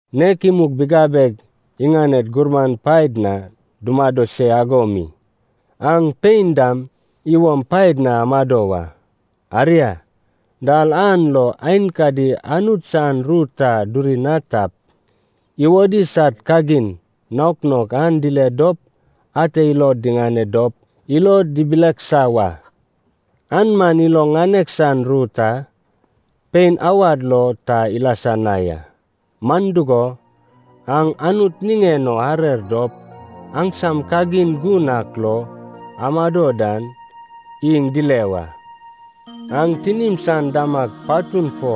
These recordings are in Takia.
Nek imug bigabeg iŋaned gurman paed na dumado se ago mi, aŋ pein dam iwom paed na amado wa. Aria, dal an lo aenkadi Anut san ru ta duri na tap, iwodi sad kagin naok naok an dile dop ate ilod diŋane dop ilod dibileksa wa. An man ilo ŋanek san ru ta pein awad lo ta ilasa na ya. Man dugo, aŋ Anut niŋen o arer dop aŋsam kagin gun ak lo amado dan iŋ dile wa. Aŋ tinim san damag patun fo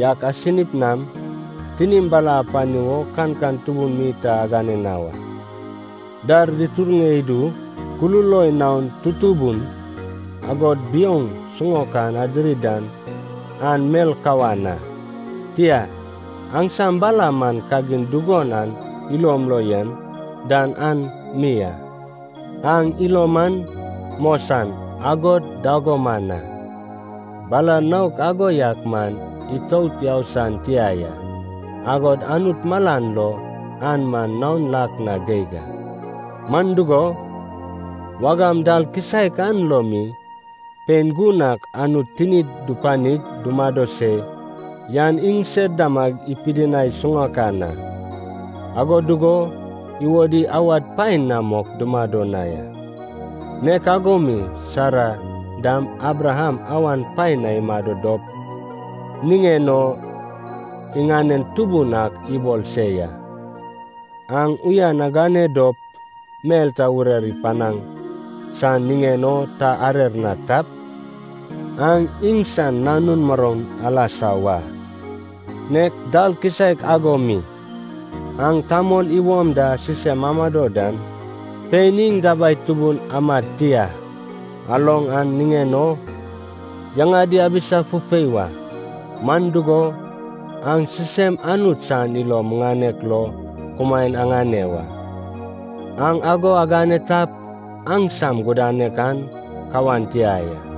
yak asinip nam tinim bala apani wo kankan tubun mi ta agane na wa. Dar diturŋe idu, kululoi naon tutubun agod biouŋ siŋaokan adiri dan an mel kawan a. Tia, aŋsam bala man kagin dugon aŋ ilom lo yen dan an mi a. Aŋ ilom man mosan, agod dagoman a. Bala naok ago yak man itout yau san tia ya, agod Anut malan lo an man naon lak na geig a. Man dugo, wagam dal kisaek an lo mi pein gun ak Anut tinid dupanig dumado se yan iŋsed damag ipidinai siŋaokan a. Ago dugo iwodi awad paen na mok dumado na ya. Nek ago mi Sara dam Abraham awan paen na imado dop niŋen o iŋanen tubun ak ibol se ya. Aŋ uyan agane dop mel ta urer ipanaŋ san niŋen o ta arer na tap, aŋ iŋsan nanun muroun alasa wa. Nek dal kisaek ago mi, aŋ tamol iwom da sisem amado dan, pein iŋ dabai tubun amad tia aloŋ an niŋen o yaŋadi abisa fufei wa. Man dugo, aŋ sisem Anut san ilo muŋanek lo kumaen aŋane wa. Aŋ ago agane tap, aŋsam gudanek an kawan tia ya.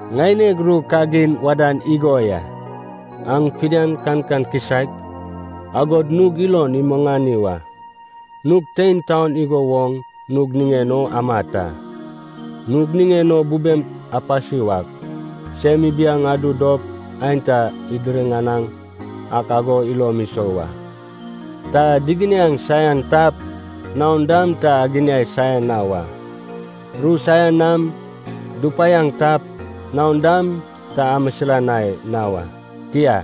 Ŋaineg ru kagin wadan igo ya. Aŋ fidian kankan kisaek, agod nug ilon imuŋani wa. Nug tein taon igo woŋ nug niŋen o amat a. Nug niŋen o bubem apasi wak, sem ibiaŋ adu dop aenta diriŋanaŋ ak ago ilom isou wa. Ta diginiaŋ saian tap, naon dam ta aginiai saian na wa. Ru saian nam dupaiaŋ tap, naon dam ta amisilanai na wa. Tia,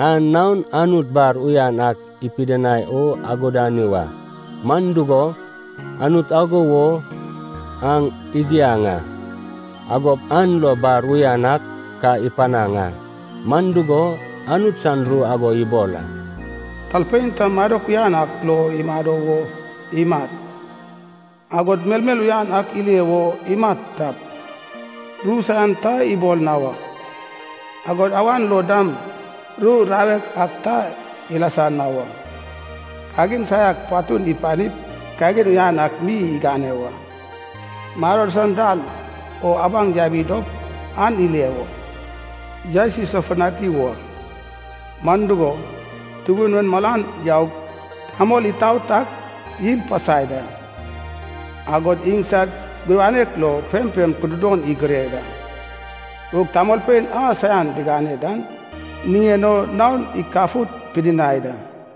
an naon Anut bar uyan ak ipidinai o agudani wa. Man dugo, Anut ago wo aŋ igiaŋ a. Agop an lo, bar uyan ak ka ipanaŋ a. Man dugo, Anut san ru ago ibol a, “Talpein ta madok uyan ak lo imado wo imat, agod melmel uyan ak ile wo imat tap, ru saian ta ibol na wa, agod awan lo dam ru rawek ak ta ilasa na wa. Kagin saiak patun ipanip kagin uyan ak mi igane wa. Maror san dal o abaŋ yabi dop an ile wo yaes isofutani wa. Man dugo, Tubun en malan yaug tamol itaot ak yil pasai da, agod iŋsad gudanek lo pempem kududon igure da. Gug tamolpein a saian digane dan niŋen o naon ikafut pidinai da.”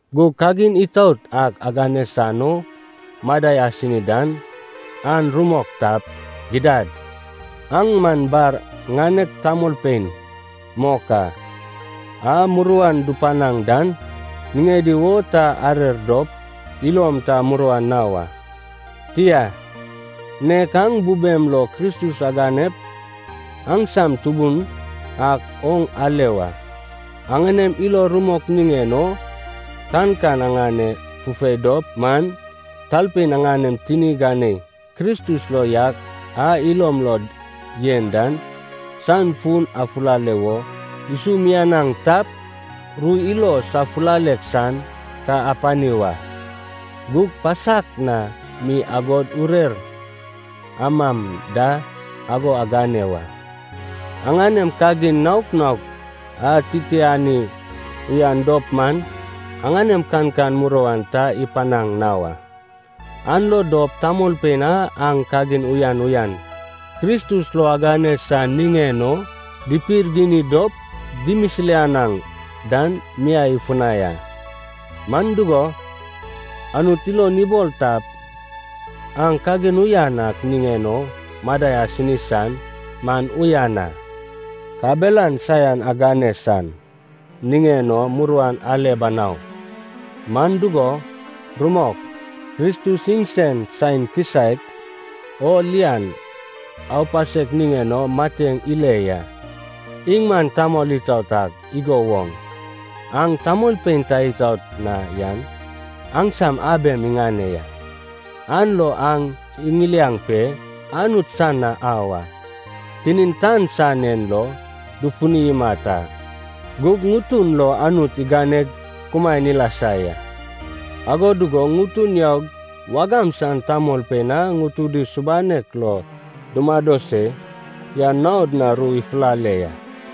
Gug kagin itaot ak agane san o madai asini dan an rumok tap, gidad, aŋ man bar ŋanek tamolpein mok a. A muruan dupanaŋ dan niŋedi wo ta arer dop ilom ta muruan na wa. Tia, nek aŋ bubem lo Kristus aganep aŋsam Tubun ak oŋ ale wa. Aŋanem ilo rumok niŋen o kankan aŋane fufei dop man, talpein aŋanem tini ganei Kristus lo yak a ilom lo yen dan san fun afulale wo isumianaŋ tap, ru ilo safulalek san ka apani wa. Gug pasak na mi agod urer amam da ago agane wa. Aŋanem kagin naok naok atitiani uyan dop man aŋanem kankan muruan ta ipanaŋ na wa. An lo dop tamolpein a aŋ kagin uyan uyan Kristus lo agane san niŋen o dipirgini dop dimisilanaŋ dan miai ifunai a. Man dugo, Anut ilon ibol tap aŋ kagin uyan ak niŋen o madai asini san man uyan a. Kabelan saian agane san niŋen o muruan ale banau. Man dugo rumok, Kristus iŋsen saen kisaek o lian aupasek niŋen o mateŋ ile ya. Iŋ man tamol itaot ak igo woŋ aŋ tamolpein ta itaot na yan aŋsam abem iŋane ya, an lo aŋ iŋiliaŋ pe Anut san na au a. Tinin tan san en lo dufuni imat a, gug ŋutun lo Anut iganeg kumaen ilasa ya. Ago dugo ŋutun yaug wagam san tamolpein a ŋutudi subanek lo dumado se yan naod na ru ifulale ya.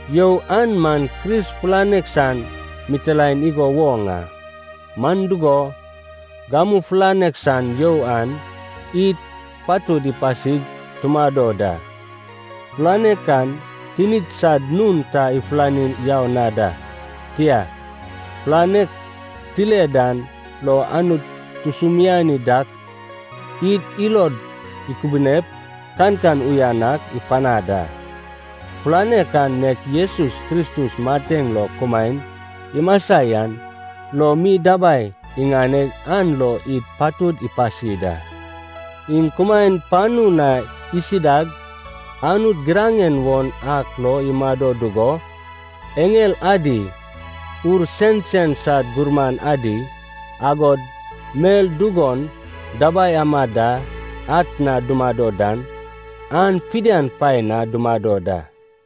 You an man Kris fulanek san mitilaen igo woŋ a. Man dugo, gamu fulanek san you an id patud ipasig tumado da. Fulanek an tinid sad nun ta ifulani yau na da. Tia, fulanek tile dan lo Anut tusumiani dak id ilod ikubunep kankan uyan ak ipanad a. Fulanek an nek Jesus Kristus mateŋ lo kumaen imasa yan lo mi dabai iŋaneg an lo id patud ipasi da. Iŋ kumaen panu na isidag Anut giraŋen won ak lo imado dugo eŋel adi, ur sensen sad gurman adi, agod mel dugon dabai amad da atna dumado dan, an fidian paen na dumado da.